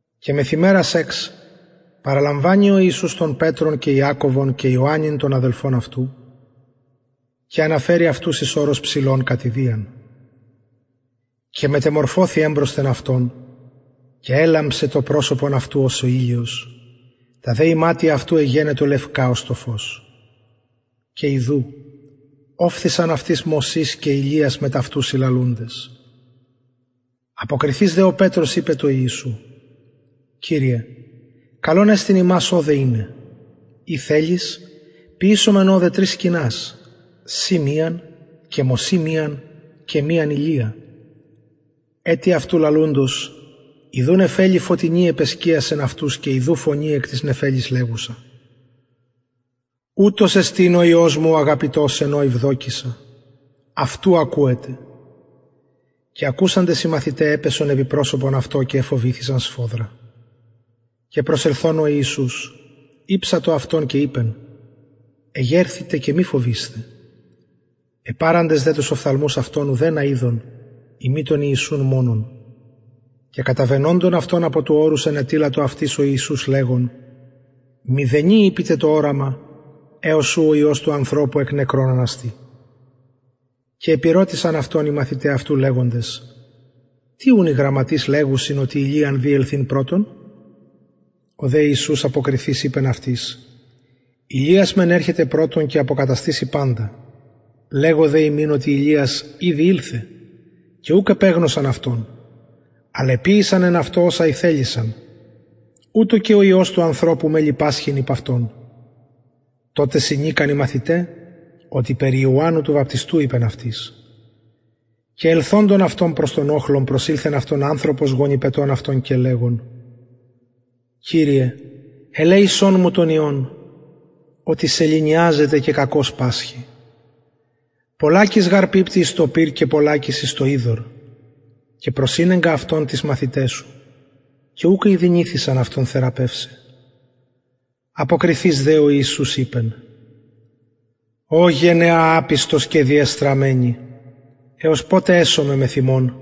και μεθ ημερας εξ παραλαμβανει ο ιησους τον πετρον και ιακωβον και ιωαννην τον αδελφον αυτου και αναφερει αυτους εις ορος υψηλον κατ ιδιαν και μετεμορφωθη εμπροσθεν αυτων και ελαμψεν το προσωπον αυτου ως ο ηλιος τα δε ιματια αυτου εγενοντο λευκα ως το φως και ιδου ωφθησαν αυτοις μωσης και ηλιας μετ αυτου συλλαλουντες αποκριθεις δε ο πετρος ειπεν τω ιησου κυριε καλον εστιν ημας ωδε ειναι ει θελεις ποιησωμεν ωδε τρεις σκηνας σοι μιαν και μωση μιαν και μιαν ηλια ετι αυτου λαλουντος ιδου νεφελη φωτεινη επεσκιασεν αυτους και ιδου φωνη εκ της νεφελης λεγουσα ουτος εστιν ο υιος μου ο αγαπητος εν ω ευδοκησα αυτου ακουετε και ακουσαντες οι μαθηται επεσον επι προσωπον αυτων και εφοβηθησαν σφοδρα και προσελθων ο ιησους ηψατο αυτων και ειπεν εγερθητε και μη φοβεισθε επαραντες δε τους οφθαλμους αυτων ουδενα ειδον ει μη τον ιησουν μονον και καταβαινοντων αυτων εκ του ορους ενετειλατο αυτοις ο ιησους λεγων μηδενι ειπητε το οραμα εως ου ο υιος του ανθρωπου εκ νεκρων αναστη και επηρωτησαν αυτον οι μαθηται αυτου λεγοντες τι ουν οι γραμματεις λεγουσιν οτι ηλιαν δει ελθειν πρωτον ο δε ιησους αποκριθεις ειπεν αυτοις ηλιας μεν ερχεται πρωτον και αποκαταστησει παντα λεγω δε υμιν οτι ηλιας ηδη ηλθεν και ουκ επεγνωσαν αυτον αλλα εποιησαν εν αυτω οσα ηθελησαν ουτως και ο υιος του ανθρωπου μελλει πασχειν υπ αυτων τοτε συνηκαν οι μαθηται οτι περι ιωαννου του βαπτιστου ειπεν αυτοις και ελθοντων αυτων προς τον οχλον προσηλθεν αυτω ανθρωπος γονυπετων αυτον και λεγων κυριε ελεησον μου τον υιον οτι σεληνιαζεται και κακως πασχει πολλακις γαρ πιπτει εις το πυρ και πολλακις εις το υδωρ και προσηνεγκα αυτον τοις μαθηταις σου και ουκ ηδυνηθησαν αυτον θεραπευσαι αποκριθεις δε ο ιησους ειπεν ω γενεα απιστος και διεστραμμενη εως ποτε εσομαι μεθ υμων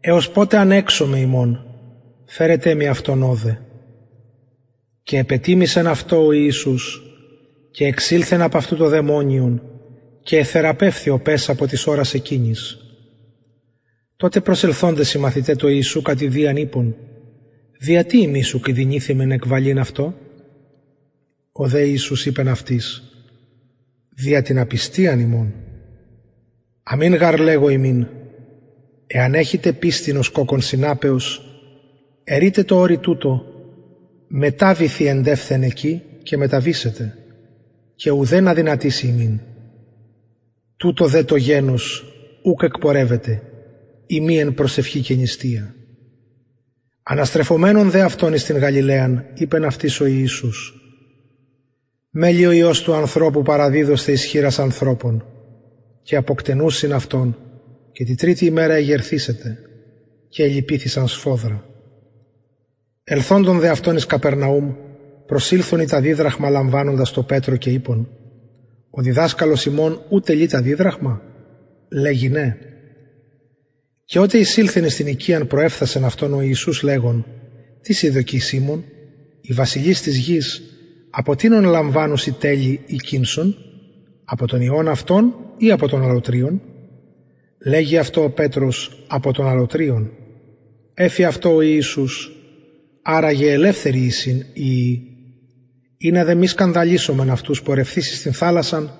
εως ποτε ανεξομαι υμων φερετε μοι αυτον ωδε και επετιμησεν αυτω ο ιησους και εξηλθεν απ αυτου το δαιμονιον και εθεραπευθη ο παις απο της ωρας εκεινης τοτε προσελθοντες οι μαθηται τω ιησου κατ ιδιαν ειπον δια τι ημεις ουκ ηδυνηθημεν εκβαλειν αυτο ο δε ιησους ειπεν αυτοις δια την απιστιαν υμων αμην γαρ λεγω υμιν εαν εχητε πιστιν ως κοκκον σιναπεως ερειτε τω ορει τουτω μεταβηθι εντευθεν εκει και μεταβησεται και ουδεν αδυνατησει υμιν τουτο δε το γενος ουκ εκπορευεται ει μη εν προσευχη και νηστεια αναστρεφομενων δε αυτων εν τη γαλιλαια ειπεν αυτοις ο ιησους μελλει ο υιος του ανθρωπου παραδιδοσθαι εις χειρας ανθρωπων και αποκτενουσιν αυτον και τη τριτη ημερα εγερθησεται και ελυπηθησαν σφοδρα ελθοντων δε αυτων εις καπερναουμ προσηλθον οι τα διδραχμα λαμβανοντες τω πετρω και ειπον ο διδασκαλος υμων ου τελει τα διδραχμα λεγει ναι και οτε εισηλθεν εις την οικιαν προεφθασεν αυτον ο ιησους λεγων τι σοι δοκει σιμων οι βασιλεις της γης απο τινων λαμβανουσιν τελη η κηνσον απο των υιων αυτων η απο των αλλοτριων λεγει αυτω ο πετρος απο των αλλοτριων εφη αυτω ο ιησους αρα γε ελευθεροι εισιν οι υιοι ινα δε μη σκανδαλισωμεν αυτους πορευθεις εις την θαλασσαν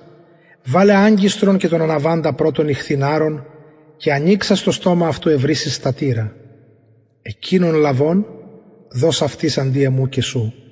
βαλε αγκιστρον και τον αναβαινοντα πρωτον ιχθυν αρον και ανοιξας το στομα αυτου ευρησεις στατηρα εκεινον λαβων δος αυτοις αντι εμου και σου